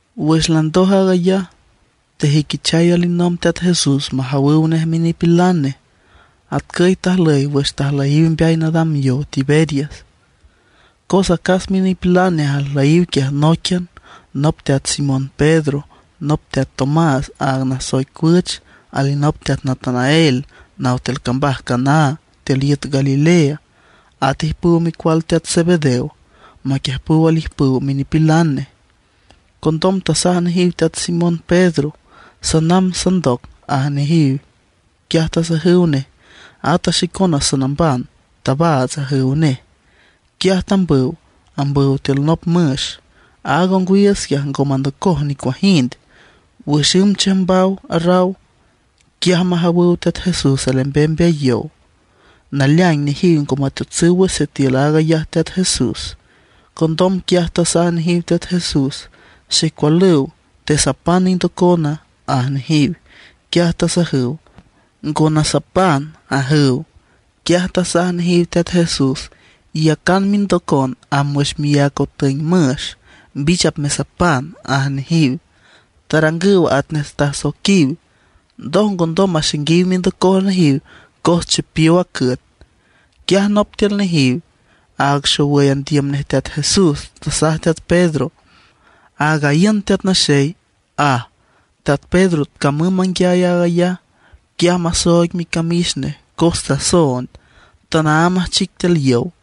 Wüx landoj aag ayaj, tejüiquichay alinomb Teat Jesús majawüw nej minipilan nej. Atcüy tajlüy wüx tajlüyiw mbeay nadam yow Tiberias. Cos acas minipilan nej ajlüyiw quiaj nóiquian, nop teat Simón Pedro, nop teat Tomás aaga nasoic Cuüch, alinop teat Natanael naw tiül cambaj Caná tiül iüt Galilea, at ijpüw micual teat Zebedeo, maquiüjpüw alijpüw minipilan nej. Condom tasaj nejiw teat Simón Pedro: ―Sanamb sandoc ―aj nejiw. Quiaj tasajüw nej: ―Ata xicona sanamban, tabaats ―ajüw nej. Quiaj tambüw, ambüw tiül nop müx. Aaga ongwiiüts quiaj ngo mandocoj nicuajind. Wüx ümb chiüjmbaw raw, quiaj majawüw Teat Jesús alembem mbeay yow. Naleaing nejiw ngo mateotsüw wüx sitiül aag ayaj Teat Jesús. Condom quiaj tasaj nejiw Teat Jesús: ―Xecualüw ¿tesapan indocona? ―aj nejiw. Quiaj tasajüw: ―Ngo nasapan ―ajüw. Quiaj tasaj nejiw Teat Jesús: ―Iyacan mindocon amb wüx miác otüeng müx, mbich apmesapan ―aj nejiw. Tarangüw atnej tasoiquiw. Ndoj ngondom maxainguiw mindocoj nejiw cos chipiow a cüet. Quiaj nop tiül nejiw, aaga xowüy andiüm nej Teat Jesús, tasaj teat Pedro: ―¡Aaga iün Teat Naxey! ―aj. Teat Pedro camüm manguiay aag ayaj, quiaj masooig micamix nej cos tasoond, tanaámb ajchic tiül yow.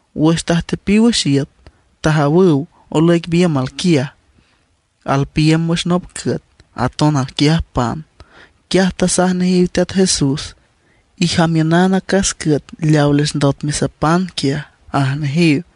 Wüx tajtepiw wüx iüt, tajawüw olüic biümb quiaj. Alpiiüm wüx nop cüet, aton alquiaj pan. Quiaj tasaj nejiw Teat Jesús: ―Ijamiünan acas cüet leawa les ndot mesapan quiaj ―aj nejiw.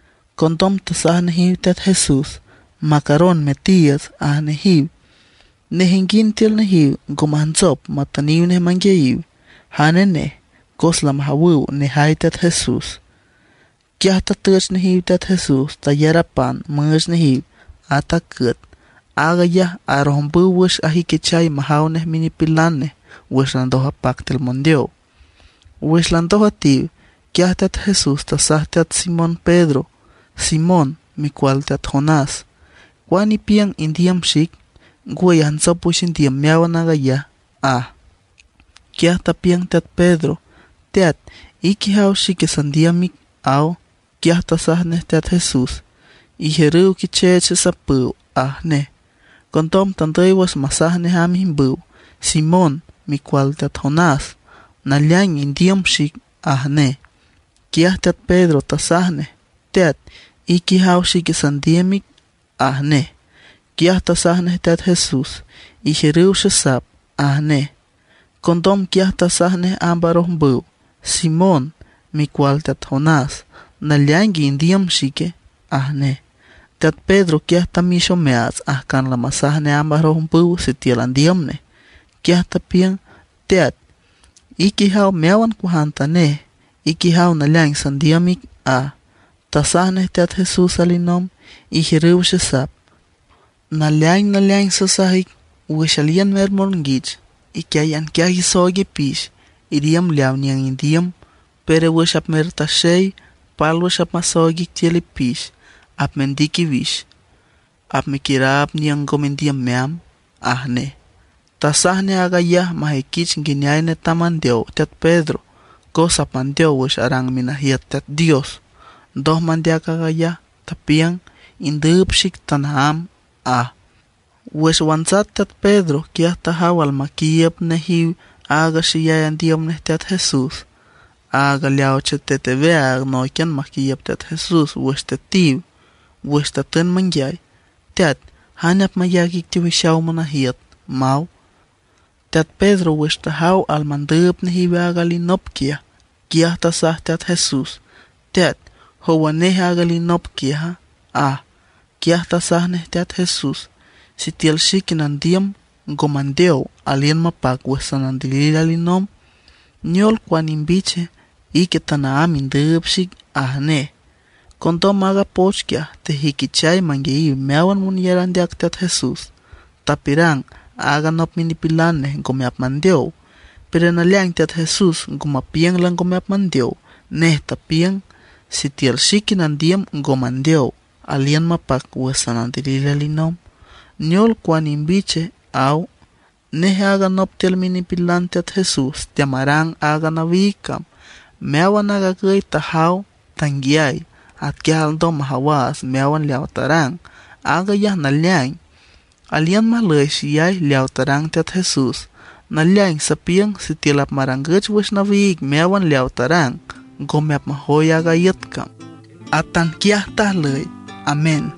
Condom tasaj nejiw Teat Jesús: ―Macaron metiiüts ―aj nejiw. Nejinguind tiül nejiw ngo majntsop matüniw nej manguiayiw jane nej, cos lamajawüw nejay Teat Jesús. Quiaj tatüch nejiw Teat Jesús, tayar a pan müüch nejiw, at a cüet. Aag ayaj arojmbüw wüx ajüiquichay majaw nej minipilan nej, wüx landoj apac tiül mondeow. Wüx landoj üetiw, quiaj Teat Jesús tasaj teat Simón Pedro: ―Simón, micual teat Jonás ¿cuane ipiüng, indiüm xic, ngwüy ajntsop wüx indiüm meáwan aag ayaja? ―aj. Quiaj tapiüng teat Pedro: ―Teat, ique ijaw xique sandiüm ic ―aw. Quiaj Teat Jesús tasaj nej: ―Ijiürüw quicheech xesapüw ―aj nej. Condom tandüy wüx masaj nej amb ijmbüw: ―Simón, micual teat Jonás ¿naleaing indiüm xic? ―aj nej. Quiaj teat Pedro tasaj nej: ―Teat, ique ijaw xique sandiüm ic ―aj nej. Quiaj tasaj nej Teat Jesús: ―Ijiürüw xesap ―aj nej. Condom quiaj tasaj nej amb arojmbüw: ―Simón, micual teat Jonás ¿naleaingue indiüm xique? ―aj nej. Teat Pedro quiaj tamix omeaats ajcan lamasaj nej amb arojmbüw sitiül andiüm nej, quiaj tapiüng: ―Teat, ique ijaw meáwan cuajantanej; ique ijaw naleaing sandiüm ic ―aj. Tasaj nej Teat Jesús alinomb: ―Ijiürüw xesap. Naleaing naleaing sasaj ic, wüx aliün mermonguich, iquiáyan quiaj isooig ipix, iriümb leaw niüng indiüm; pero wüx apmertaxey pálwüx apmasooig ic tiül ipix, apmendic iwix, apmequiüraab niüng ngo mendiüm meamb ―aj nej. Tasaj nej aag ayaj majüiquich nguineay netam mandeow teat Pedro, cos apmandeow wüx arang minajiüt Teat Dios. Ndoj mandeac aag ayaj, tapiüng: ―Indüüb xic tanaámb ―aj. Wüx wantsat teat Pedro, quiaj tajaw almandüüb nejiw aaga xeyay andiüm nej Teat Jesús, aaga leaw chetet aweaag nóiquian maquiiüb Teat Jesús wüx tetiw, wüx tatün manguiay: “Teat ¿jane apmayac ic teowixaw monajiüt?” maw. Teat Pedro wüx tajaw almandüüb nejiw aaga alinop quiaj, quiaj tasaj Teat Jesús: ―Teat ¿jowa neje aaga alinop quiaja? ―aj. Quiaj tasaj nej Teat Jesús: ―Sitiül xique nandiüm ngo mandeow, aliün mapac wüx sanandilil alinomb, ¿neol, cuane imbiche? Ique tanaámb indüüb xic ―aj nej. Condom aaga poch quiaj tejüiquichay manguiayiw meáwan monyar andeac Teat Jesús, tapiürang aaga nop minipilan nej ngome apmandeow. Pero naleaing Teat Jesús ngo mapiüng lango mandeow. Nej tapiüng: “Sitiül xique nandiüm ngo mandeow, aliün mapac wüx sanandilil alinomb, ¿neol, cuane imbich?”, aw. Nej aaga nop tiül minipilan Teat Jesús teamarang aaga nawiig cam. Meáwan aag agüy tajaw, tanguiay. Atquiaj alndom majawaats meáwan leaw tarang, aag ayaj naleaing. Aliün majlüy xeyay leaw tarang Teat Jesús. Naleaing sapiüng sitiül apmarangüch wüx nawiig meáwan leawa tarang, ngome apmajoy aaga iüt cam. Atanquiaj tajlüy. Amén.